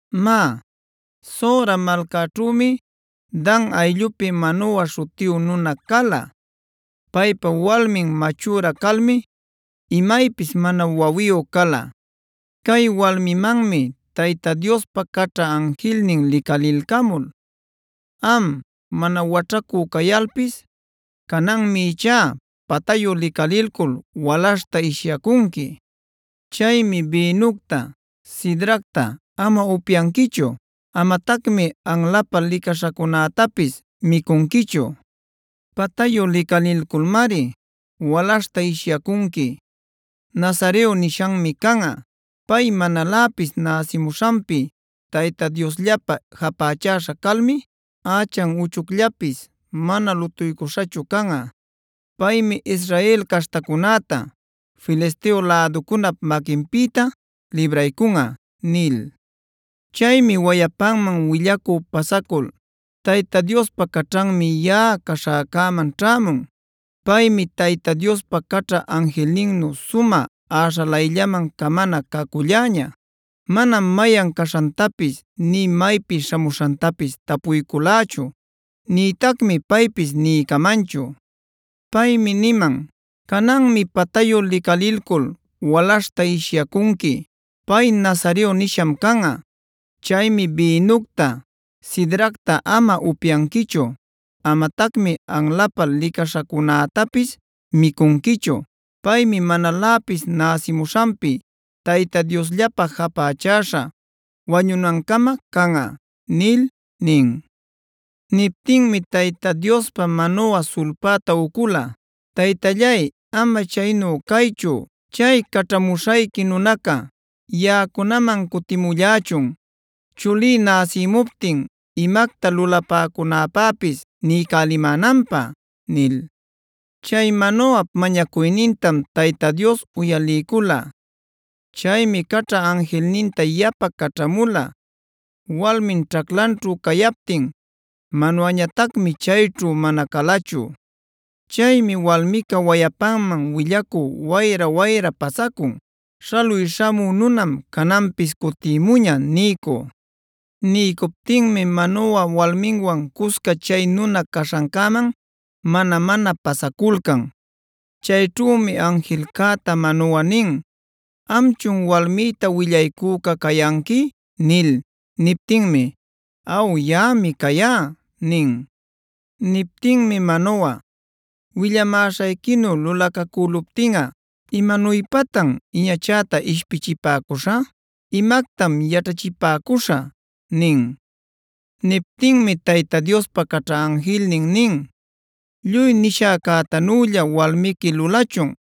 Má, Zora malcaćhümi Dan ayllupi Manoa śhutiyu nuna cala. Paypa walmin machüra calmi imaypis mana wawiyu cala. Cay walmimanmi Tayta Diospa caćha anjilnin licalilcamul: “Am, mana waćhacü cayalpis, cananmi ichá patayu licalilcul walaśhta ishyacunqui. Chaymi bïnucta, sidracta ama upyanquichu. Amatacmi anlapä licaśhacunätapis micunquichu. Patayu licalilculmari walaśhta ishyacunqui. Nazareo nishanmi canꞌa. Pay manaläpis näsimuśhanpi Tayta Diosllapä japächäśhaa calmi ächan uchucllapis mana lutuycuśhachub canꞌa. Paymi Israel caśhtacunäta Filisteo läducunap maquinpïta libraycunꞌa” nil. Chaymi wayapanman willacü pasacul: “Tayta Diospa caćhanmi yaꞌa caśhäcäman ćhämun. Paymi Tayta Diospa caćha anjilninnu sumä äśhalayllaman camana caculläña. Manam mayan caśhantapis nï maypi śhamuśhantapis tapuyculächu, nïtacmi paypis niycamanchu. Paymi niman: ‘Cananmi patayu licalilcul walaśhta ishyacunqui. Pay nazareo nisham canꞌa. Chaymi bïnucta, sidracta ama upyanquichu. Amatacmi anlapä licaśhacunätapis micunquichu. Paymi manaläpis näsimuśhanpi Tayta Diosllapä japächäśha wañucunancama canꞌa’ nil” nin. Niptinmi Tayta Diospa Manoa sulpäta ucula: “Taytallay, ama chaynu caychu, chay caćhamuśhayqui nunaca yaꞌacunaman cutimullächun, chulí näsïmuptin imacta lulapäcunäpäpis niycälimänanpä” nil. Chay Manoap mañacuynintam Tayta Dios uyaliycula. Chaymi caćha anjilninta yapa caćhamula walmin ćhaclanćhu cayaptin. Manoañatacmi chayćhu mana calachu. Chaymi walmica wayapanman willacü wayra-wayra pasacun: “Śhaluy śhamü nunam cananpis cutïmuña” niycü. Niycuptinmi Manoa walminwan cusca chay nuna caśhancäman mana-mana pasaculcan. Chayćhümi anjilcäta Manoa nin: “¿Amchun walmïta willaycüca cayanqui?” nil. Niptinmi: “Aw, yaꞌami cayá” nin. Niptinmi Manoa: “Willamäśhayquinu lulacacüluptinꞌa, ¿imanuypatan iñachäta ishpichipacüśhä? ¿Imactam yaćhachipäcuśhä?” nin. Niptinmi Tayta Diospa caćha anjilnin nin: “Lluy nishäcätanülla walmiqui lulachun.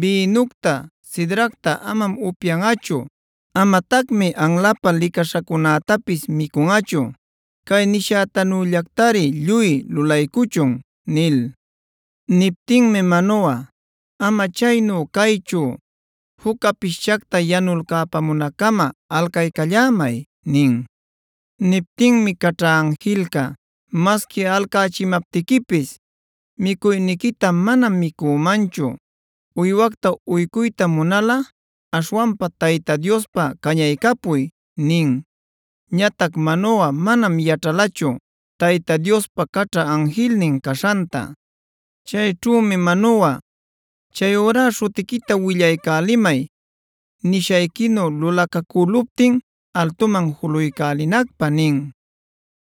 Bïnucta, sidracta amam upyanꞌachu. Amatacmi anlapä licaśhacunätapis micunꞌachu. Cay nishäcunallactari lluy lulaycuchun” nil. Niptinmi Manoa: “Ama chaynu caychu, juc capischacta yanulcäpamunaccama alcaycallämay” nin. Niptinmi caćha anjilca: “Masqui alcachimaptiquipis micuyniquita manam micümanchu. Uywacta uycuyta munalꞌa aśhwanpa Tayta Diospä cañaycapuy” nin. Ñatac Manoa manam yaćhalachu Tayta Diospa caćha anjilnin caśhanta. Chayćhümi Manoa: “Chayurá śhutiquita willaycälimay nishayquinu lulacacäluptin altuman juluycälinacpä” nin.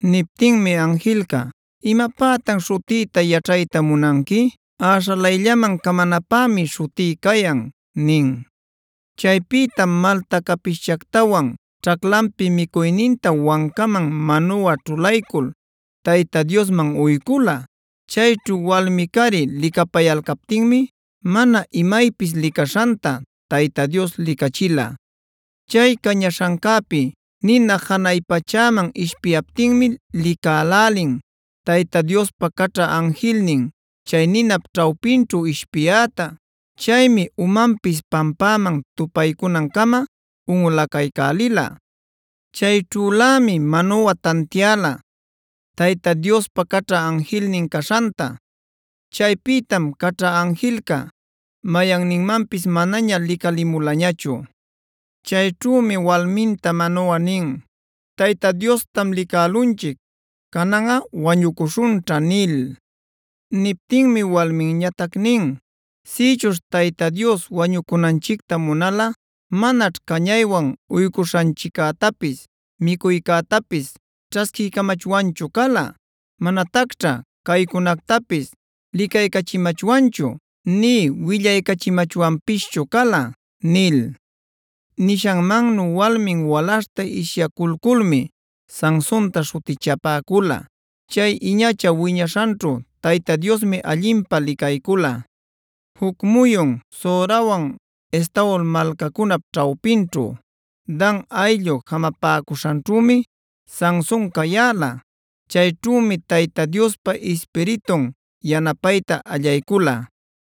Niptinmi anjilca: “¿Imapätan śhutïta yaćhayta munanqui? Äśhalayllaman camanapämi śhutí cayan” nin. Chaypïtam malta capishchactawan ćhaclanpi micuyninta wancaman Manoa ćhulaycul Tayta Diosman uycula. Chayćhu walmi-cari licapayalcaptinmi mana imaypis licaśhanta Tayta Dios licachila. Chay cañaśhancäpi nina janay pachäman ishpiyaptinmi licälälin Tayta Diospa caćha anjilnin chay ninap ćhawpinćhu ishpiyäta. Chaymi umanpis pampäman tupaycunancama unꞌulacaycälila. Chayćhülämi Manoa tantiäla Tayta Diospa caćha anjilnin caśhanta. Chaypïtam caćha anjilca mayanninmanpis manaña licalimulañachu. Chayćhümi walminta Manoa nin: “Tayta Diostam licälunchic. Cananꞌa wañucuśhunćha” nil. Niptinmi walminñatac nin: “Sïchuśh Tayta Dios wañunanchicta munalꞌa, manaćh cañaywan uycuśhanchiccätapis, micuycätapis ćhasquiycamachwanchu cala. Manatacćha caycunactapis licayächimachwanchu, nï willaycachimachwanpischu cala” nil. Nishanmannu walmin walaśhta ishyaculculmi Sansontac śhutichapäcula. Chay iñacha wiñaśhanćhu Tayta Diosmi allinpä licaycula. Juc muyun Zorawan Estaol malcacunap ćhawpinćhu, Dan ayllu jamapäcuśhanćhümi Sanson cayäla. Chayćhümi Tayta Diospa Ispiritun yanapayta allaycula.